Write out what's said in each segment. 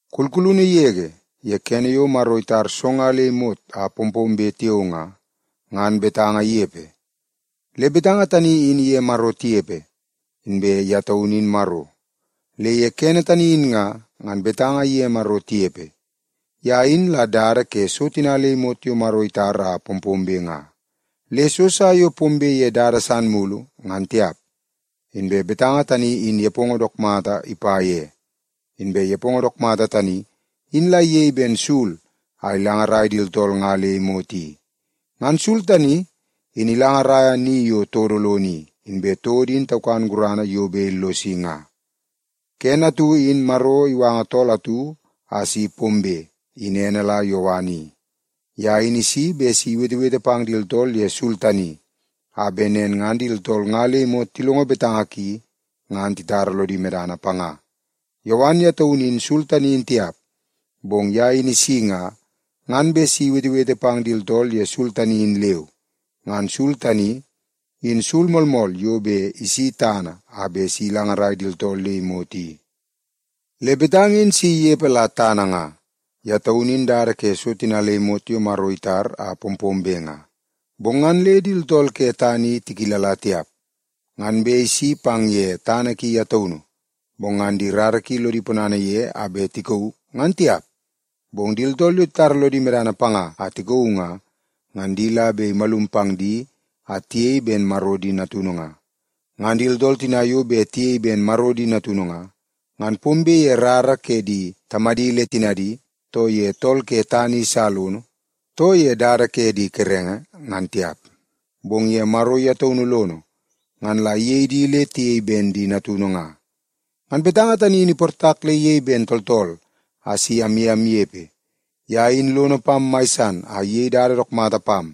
Kulkulunu yege, ye kene yo Maro itar so nga le imot a pompombe tiao nga, ngan Betanga inepe. Le Betanga tani in iye Maro tinepe, inbe ye taunu in Maro. Le ye kene tani in nga, ngan Betanga iye Maro tinepe. Ye in la dada ke so tina le imot yo Maro itar a pompombe nga. Le so sa yo pombe ye dada san mulu, ngan tiap. Inbe Betanga tani in nepongo dook mata ipa ye. Inbe nepongo dook mata tani, in la iyei ben sul a ilangarai di tooltool nga le imot i. Ngan sul tani, in ilangaraia ni yo todo lono i, inbe todo in taukan gurana yo bet illosi nga. Kene atu in Maro iwanga tool atu a si pombe, in ene la Yowan i. Ye in isi bet si iwetewete pang di tooltool ye sul tani, a bet nen ngan di tooltool nga le imot tilongo betanga ki ngan titara lodi medana panga. Yowan ye taunu in sul tani in tiap. Bong ye in isi nga, ngan bet si iwetewete pang di tooltool ye sul tani in leu. Ngan sul tani, in sul moolmool yo bet isi tana a bet si ilangarai di tooltool le imot i. Le Betanga tani in si inepe la tana nga. Ye taun in dada ke so tina le imot yo Maro itar a pompombe nga, bong ngan le di tooltool ke tana i tikilala tiap. Ngan bet isi pang ye tana ki ye taunu, bong ngan di rara ki lodi ponana ye a bet tikauu, ngan tiap. Bong di tooltool yo titara lodi medana panga a tikauu nga, ngan di la bet imalum pang di a tiyei ben Maro di natunu nga. Ngan di tooltool tina yo bet tiyei ben Maro di natunu nga, ngan pombe ye rara ke di tamadi le tinadi, too ye tool ke tana i sa lono, too ye dada ke di kerenge, ngan tiap, bong ye Maro ye taunu lono ngan la iyei di le tiyei ben di natunu nga. Ngan Betanga tani in iportak le iyei ben tooltool a si amye amnepe. Ye in lono pam mai san a iyei dada dook mata pam,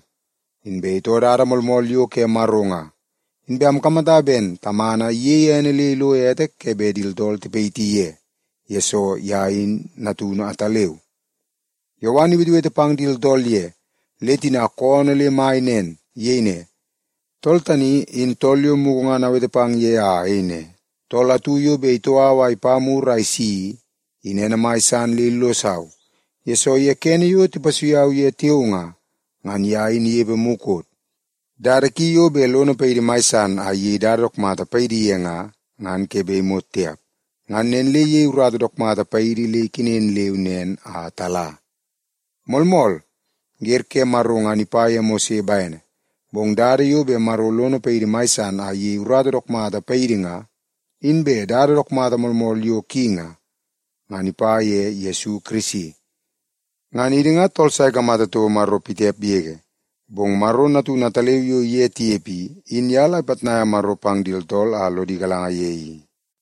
inbe itoo dada moolmool yo ke Maro nga. Inbe amkamata ben Tamana iyeie ene le ilo ete ke bet di tooltool tipayiti ye, yesoo ye in Natunu ataleu. Yowan iwetewete pang di tooltool ye, le tina koonoo le mai nen. Iyei ne, “Tool tani, in tool yo mugu ngan awete pang ye a ayei ne, ‘Tool atu yo bet itoo au a ipa mur a isi i, in ene mai san le illosau, yesoo ye kene yo tipasui au ye tiao nga, ngan ye in inepe mukot.’” Dada ki yo bet lono paidi mai san a iyei dada dook mata paidi ye nga, ngan ke bet imot tiap. Ngan nen le iyei urata dook mata paidi le ikenen leu nen a tala. Moolmool, wer ke Maro ngan ipa ye Mose bene, bong dada yo bet Maro lono paidi mai san a iyei urata dook mata paidi nga, inbe dada dook mata moolmool yo ki nga, ngan ipa ye Yesu Kirisi. Ngan idi nga tool sa ikamata toko Maro pitiap yege. Bong Maro Natunu ataleu yo iye tinepe i, in ye la ipitnaia Maro pang di tooltool a lodi galanga ye i.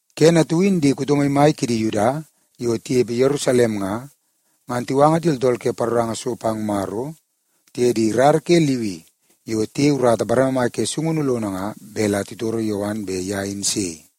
Kene atu in di kuto maimai kidi Yuda yo tinepe Yerusalem nga, ngan tiwanga di tooltool ke paroranga so pang Maro, tiye di rara ke Liwi yo tiyei urata bareme mai ke sungunu lono ngan bet la titoro Yowan bet ye in sei.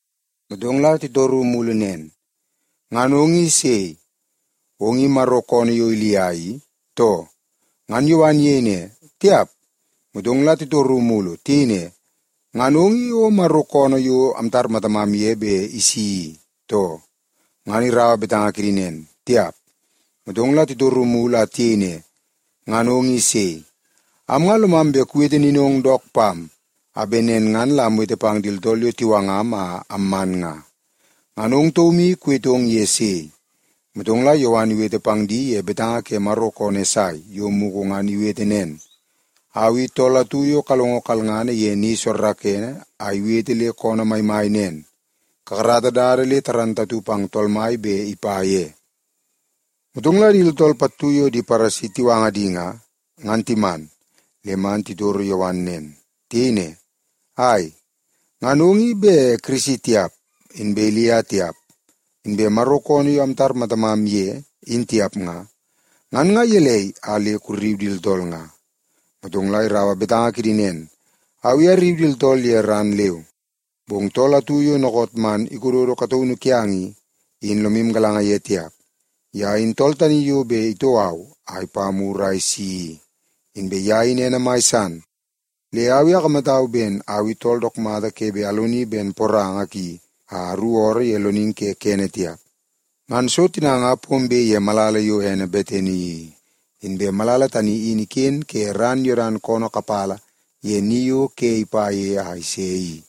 Motong la titoru mulu nen, “Ngan ong i sei? Ong i Maro koonoo yo Ilia i, too?” Ngan Yowan iyei ne, “Tiap.” Motong la titoru mulu. Tiyei ne, “Ngan ong i o Maro koonoo yo amtar matamam ye bet isi i, too?” Ngan iraua torungu kidi nen, “Tiap.” Motong la titoru mulu a tiyei ne, “Ngan ong i sei? Am nga lomam bet kuwete ninong dook pam, a bet nen ngan la amwete pang di tooltool yo tiwangam a amman nga. Ngan ong taum i kuwetong ye sei?” Motong la Yowan iwete pang di ye betanga ke Maro koonoo Esai yo mukot ngan iwete nen, “Au i tool atu yo kalongo kalngana ye ni soorookoonoo a iwete le koonoo maimai nen, ‘Kakarata dada le igalanga pang Tool Mai bet ipa ye.’” Motong la di tooltool pattu yo di Paresi tiwanga di nga, ngan timan le man titoro Yowan nen. Tiyei ne, “Ai, ngan ong i bet Kirisi tiap, inbe Ilia tiap, inbe Maro koonoo yo amtar matamam ye, in tiap nga, ngan nga gelei a le kurriu di tooltool nga?” Motong la iraua betanga kidi nen, “Au i arriu di tooltool ye ran leu, bong tool atu yo dookoot man ikododo kataunu kiang i, in lomu galanga ye tiap. Ye in tool tani yo bet itoo au a ipa mur a isi i. Inbe ye in ene mai san, le au i akamatau ben au i tool dook mata ke bet aloni ben poranga ki a aruku ooroo ye loningi ke kene tiap.” Ngan so tina nga pombe ye malala yo ene Betani i, inbe malala tani in iken ke ran Yodan koonoo kapala ye ni yo ke ipa ye a ise i.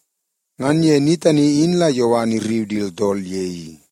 Ngan ye ni tani in la Yowan irriu di tooltool ye i.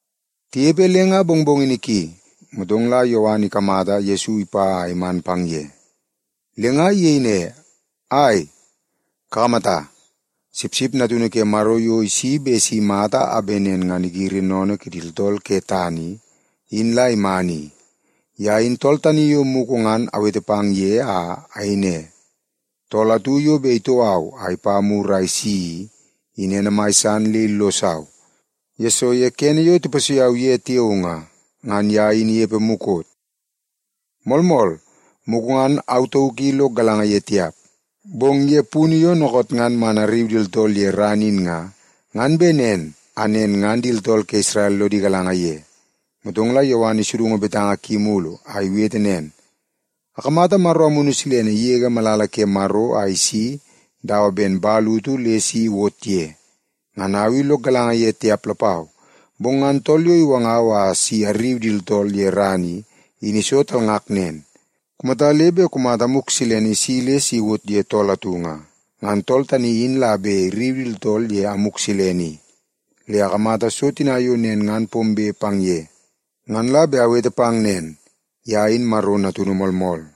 Tinepe le nga mongmongini ki, motong la Yowan ikamata Yesu ipa a iman pang ye, le nga iyei ne, “Ai, kakamata! Sipsip Natunu Ke Maro yo isi bet si imata a bet nen ngan igiri sennene kidi tooltool ke tana i, in la iman i! Ye in tool tani yo mugu ngan awete pang ye, a ayei ne, ‘Tool atu yo bet itoo au a ipa mur a isi i, in ene mai san le illosau, yesoo ye kene yo tipasui au ye tiao nga, ngan ye in inepe mukot.’ Moolmool, mugu ngan au tauk i lok galanga ye tiap. Bong ye punu yo dookoot ngan man arriu di tooltool ye ran in nga, ngan bet nen a nen ngan di tooltool ke Isrel lodi galanga ye.” Motong la Yowan isudungu betanga ki mulu a iwete nen, “Akamata Maro Amunu Silene igege malala ke Maro a isi dawa ben man utu le si iwot ye. Ngan au i lok galanga ye tiap lapau, bong ngan tool yo iwangau bet si arriu di tooltool ye ran i, in iso talngak nen, ‘Kumata le bet kumata Amuk Silene isi le si iwot ye tool atu nga, ngan tool tani in la bet irriu di tooltool ye Amuk Silene i.’ Le akamata so tina yo nen ngan pombe pang ye, ngan la bet awete pang nen: Ye in Maro Natunu moolmool.”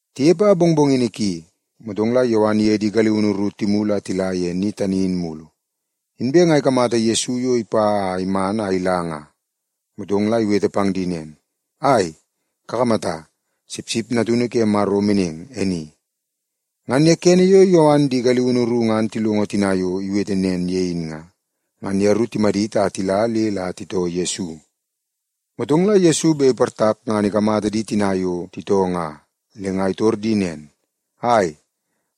Tinepe a mongmongini ki, motong la Yowan iye di galiunu ru timulu a tila ye ni tani in mulu. Inbe nga ikamata Yesu yo ipa a iman a ila nga, motong la iwete pang di nen, “Ai, kakamata! Sipsip Natunu ke Maro meneng, e ni!” Ngan ye kene yo Yowan di galiunu ru ngan tilongo tina yo iwete nen ye in nga, ngan yeru timadit a tila le la titoo Yesu. Motong la Yesu bet iportak ngan ikamata di tina yo titoo nga, le nga itor di nen, “Ai,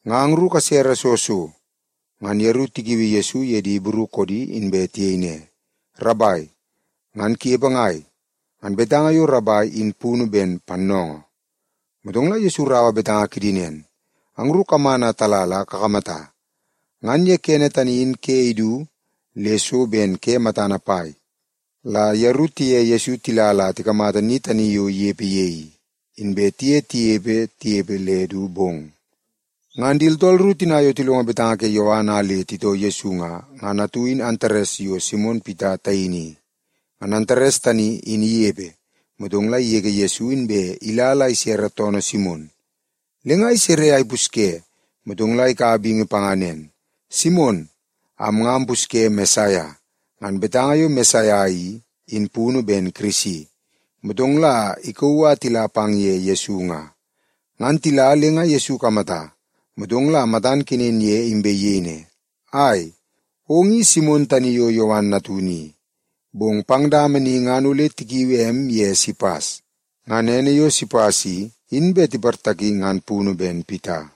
nga angru kasere soo so?” Ngan yeru tikiui Yesu ye di Ibru koodi inbe tiyei ne, “Rabai, ngan kunepe ngai?” (Ngan betanga yo “Rabai” in punu ben “Pannoongoo.”) Motong la Yesu iraua betanga kidi nen, “Angru kaman a tala la kakamata.” Ngan ye kene tani in ke idu le so ben ke matana pai la yeru tiye Yesu tila la tikamata ni tani yo inepe ye i, inbe tiye tinepe tinepe le du bong. Ngan di tooltool ru tina yo tilongo betanga ke Yowan a le titoo Yesu nga, ngan atu in Antares yo Simon Pita taini i. Ngan Antares tani in inepe, motong la igege Yesu inbe ila la isere toonoo Simon. Le nga isere a ipusye, motong la ikaua bingi panga nen, “Simon, am nga ampusye Mesaia.” (Ngan betanga yo “Mesaia” i, in punu ben “Kirisi.”) Motong la ikauu a tila pang ye Yesu nga. Ngan tila, le nga Yesu ikamata, motong la matan kenen ye, inbe iyei ne, “Ai, ong i Simon tani yo Yowan natunu i. Bong pang dama ni ngan ole tikiui em ye Sipas.” (Ngan ene yo Sipas i, in bet tiportaki ngan punu ben Pita).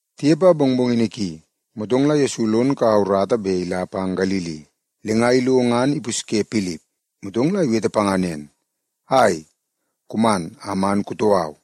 Tinepe a mongmongini ki, motong la Yesu lon kau urata bet ila pang Galili. Le nga ilo ngan ipusye Pilip, motong la iwete panga nen, “Ai, kuman a man kutoo au.”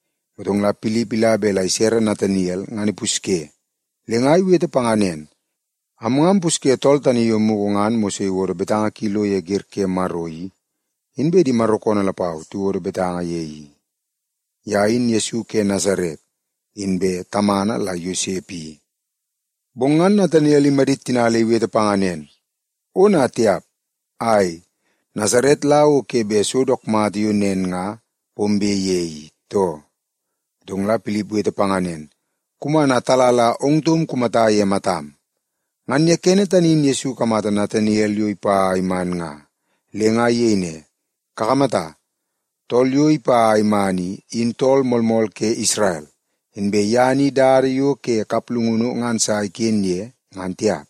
Motong la Pilip ila bet la isere Nataniel ngan ipusye, le nga iwete panga nen, “Am nga ampusye tool tani yo mugu ngan Mose iwodo betanga ki lo ye Wer ke Maro i, inbe di Maro koonoo lapau tiwodo betanga ye i. Ye in Yesu ke Nasaret, inbe tamana la Yosep i.” Bong ngan Nataniel imadit tina le iwete panga nen, “Ona tiap! Ai, Nasaret la o ke bet so dook mata yo nen nga pombe ye i, too?” Motong la Pilip iwete panga nen, “Kuman a tala la ong taum kumata ye matam.” Ngan ye kene tani in Yesu ikamata Nataniel yo ipa a iman nga, le nga iyei ne, “Kakamata, tool yo ipa a iman i, in tool moolmool ke Isrel. Inbe ye ni dada yo ke kaplungunu ngan sa iken ye, ngan tiap.”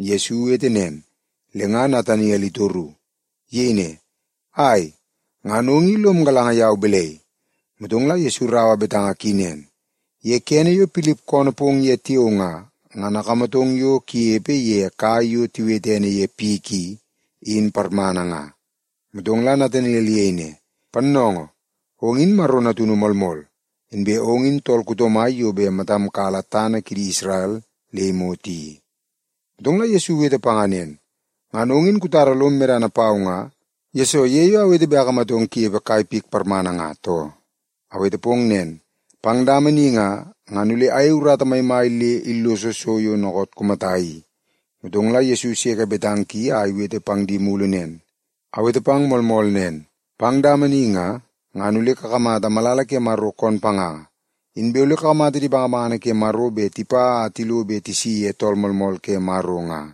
Yesu iwete nen, le nga Nataniel itoru. Iyei ne, “Ai, ngan ong i lom galanga yau balai?” Motong la Yesu iraua betanga ki nen, “Ye kene yo Pilip koonoo pong ye tiao nga, ngan akamatong yo kunepe ye kai yo tiwete ene ye pik i, in parmana nga.” Motong la Nataniel iyei ne, “Pannoongoo, ong in Maro Natunu moolmool! Inbe ong in tool kuto mai yo bet matam kala tana kidi Isrel le imot i!” Motong la Yesu iwete panga nen, “Ngan ong in kutara lom medana pau nga, yesoo ye yo awete bet akamatong kunepe kai pik parmana nga, too? Awete pong nen, pang dama ni nga, ngan ole ayei urata maimai le illoso so yo dookoot kumata i.” Motong la Yesu iseke betanga ki a iwete pang di mulu nen, “Awete pang moolmool nen, pang dama ni nga, ngan ole kakamata malala ke Maro koon panganga, inbe ole kakamata di bangabangana ke Maro bet tipa a tilo be tisi ye Tool Moolmool ke Maro nga.”